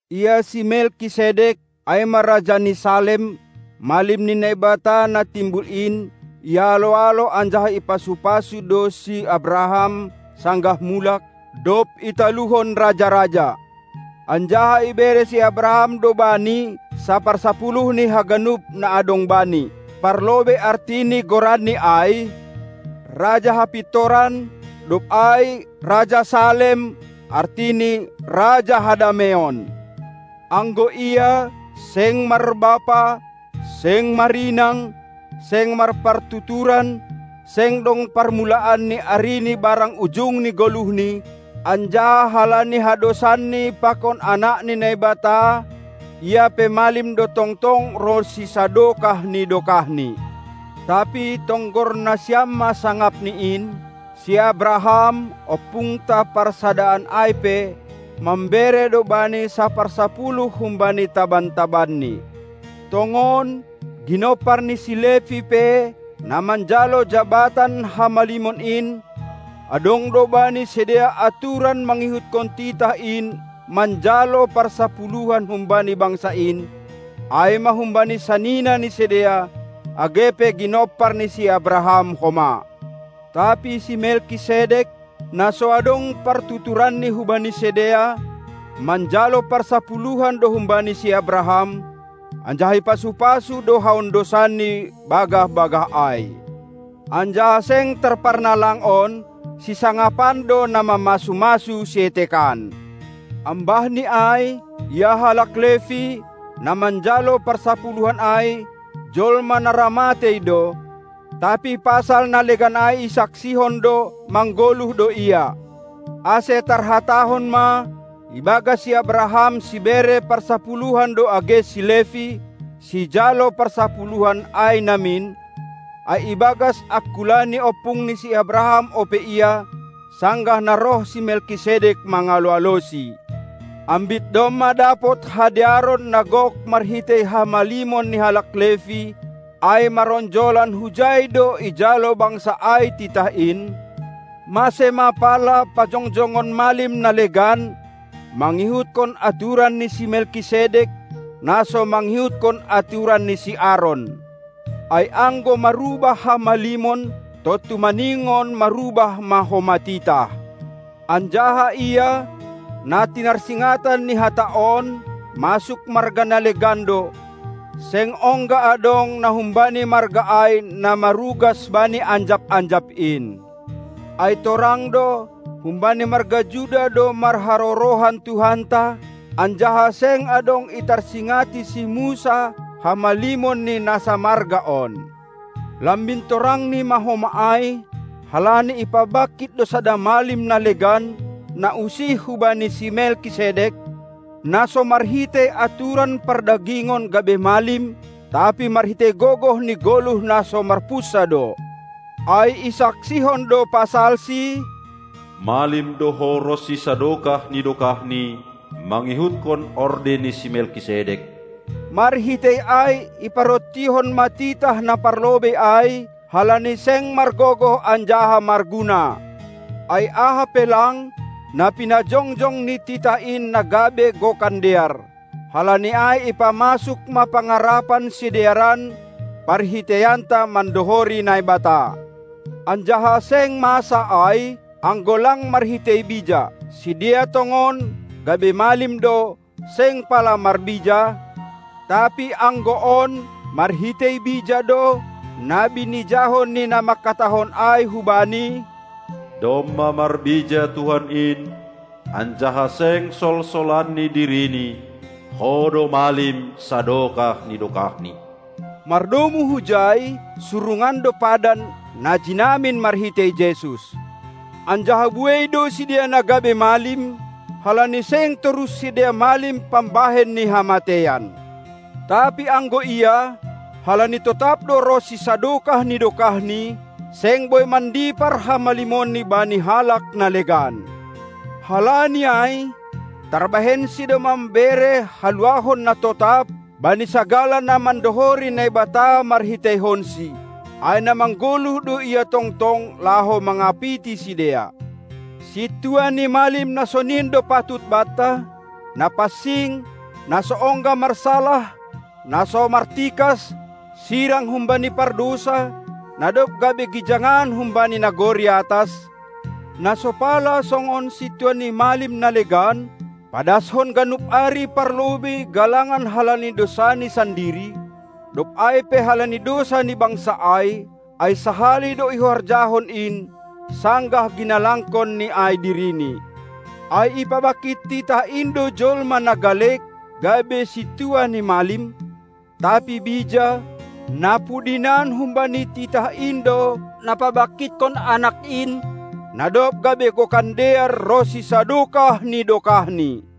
Ia si Melkisedek, ai ma raja ni Salem, malim ni Naibata na Timbul in, ialo-alo anjaha ipasu-pasu do si Abraham sanggah mulak, dob italuhon raja-raja; anjaha ibere si Abraham do bani saparsapuluh ni haganup na adong bani. Parlobei arti ni goranni ai: "Raja hapintoran", dob ai "Raja Salem", artini: Raja hadameion. Anggo ia, seng marbapa, seng marinang, seng marpartuturan, seng dong parmulaan ni arini barang ujung ni goluhni, anjaha halani hadosanni pakon Anak ni Naibata, ia pe malim do tongtong ronsi sadokah ni dokahni. Tapi tonggor nasiam ma sangapni in: Si Abraham, ompungta parsadaan ai pe, mambere do bani saparsapuluh humbani taban-tabanni. Tongon, ginompar ni si Levi pe, na manjalo jabatan hamalimon in, adong do bani sidea aturan mangihutkon titah in manjalo parsapuluhan humbani bangsa in, ai ma humbani sanina ni sidea, age pe ginompar ni si Abraham homa. Tapi si Melkisedek, na so adong partuturanni hubani sidea, manjalo parsapuluhan do humbani si Abraham, anjaha ipasu-pasu do haondosan ni bagah-bagah ai. Anjaha seng tarparnalang on: Sisangapan do na mamasu-masu sietekan. Ambahni ai, ia halak Levi, na manjalo parsapuluhan ai, jolma na ra matei do, tapi pasal na legan ai isaksihon do, manggoluh do ia. Ase tarhatahon ma: ibagas si Abraham sibere parsapuluhan do age si Levi, sijalo parsapuluhan ai namin, ai ibagas angkula ni ompungni si Abraham ope ia, sanggah na roh si Melkisedek mangalo-alosi. Ambit domma dapot hadearon na gok marhitei hamalimon ni halak Levi (ai maronjolan hujai do ijalo bangsa ai titah in), mase ma pala pajongjongon malim na legan, mangihutkon aturan ni si Melkisedek, na so mangihutkon aturan ni si Aron. Ai anggo marubah hamalimon, tontu maningon marubah ma homa titah. Anjaha Ia, na tinarsingatan ni hata on, masuk marga na legan do; seng ongga adong na humbani marga ai na marugas bani anjap-anjap in. Ai torang do, humbani marga Juda do marharorohan Tuhanta, anjaha seng adong itarsingati si Musa hamalimon ni na samarga on. Lambin torangni ma homa ai, halani ipabangkit do sada malim na legan, na usih hubani si Melkisedek, na so marhitei aturan pardagingon gabe malim, tapi marhitei gogoh ni goluh na so marpunsa do. Ai isaksihon do pasalsi: Malim do Ho ronsi sadokah ni dokahni mangihutkon orde ni si Melkisedek. Marhitei ai iparontihon ma titah na parlobei ai, halani seng margogoh anjaha marguna. Ai aha pe lang, na pinajongjong ni titah in na gabe gokan dear. Halani ai ipamasuk ma pangarapan sidearan, parhiteianta mandohori Naibata. Anjaha seng masa ai, anggo lang marhitei bija. Sidea tongon, gabe malim do, seng pala marbija, tapi anggo on, marhitei bija do, na binijahon ni na manghatahon ai hu Bani: Domma marbija Tuhan in, anjaha seng solsolanni dirini: Ho do malim sadokah ni dokahni. Mardomu hujai, surungan do padan, na jinamin marhitei Jesus. Anjaha buei do sidea na gabe malim, halani seng torus sidea malim pambahen ni hamateian. Tapi anggo Ia, halani totap do ronsi sadokah ni dokahni, seng boi mandipar hamalimonni bani halak na legan. Halani ai, tarbahensi do mambere haluahon na totap bani sagala na mandohori Naibata marhiteihonsi, ai na manggoluh do Ia tongtong laho mangapiti sidea. Sintua ni malim na sonin do patut banta, na pansing, na so ongga marsalah, na so martikas, sirang humbani pardousa, na dob gabe gijangan humbani nagori atas, na so pala songon sintua ni malim na legan, padashon ganup ari parlobei galangan halani dousani sandiri, dob ai pe halani dousa ni bangsa ai, ai sahali do ihorjahon in, sanggah ginalangkonni ai dirini. Ai ipabangkit titah in do jolma na galek gabe sintua ni malim, tapi bija, na pudinan humbani titah in do na pabangkithon Anak in, na dob gabe gokan dear ronsi sadokah ni dokahni.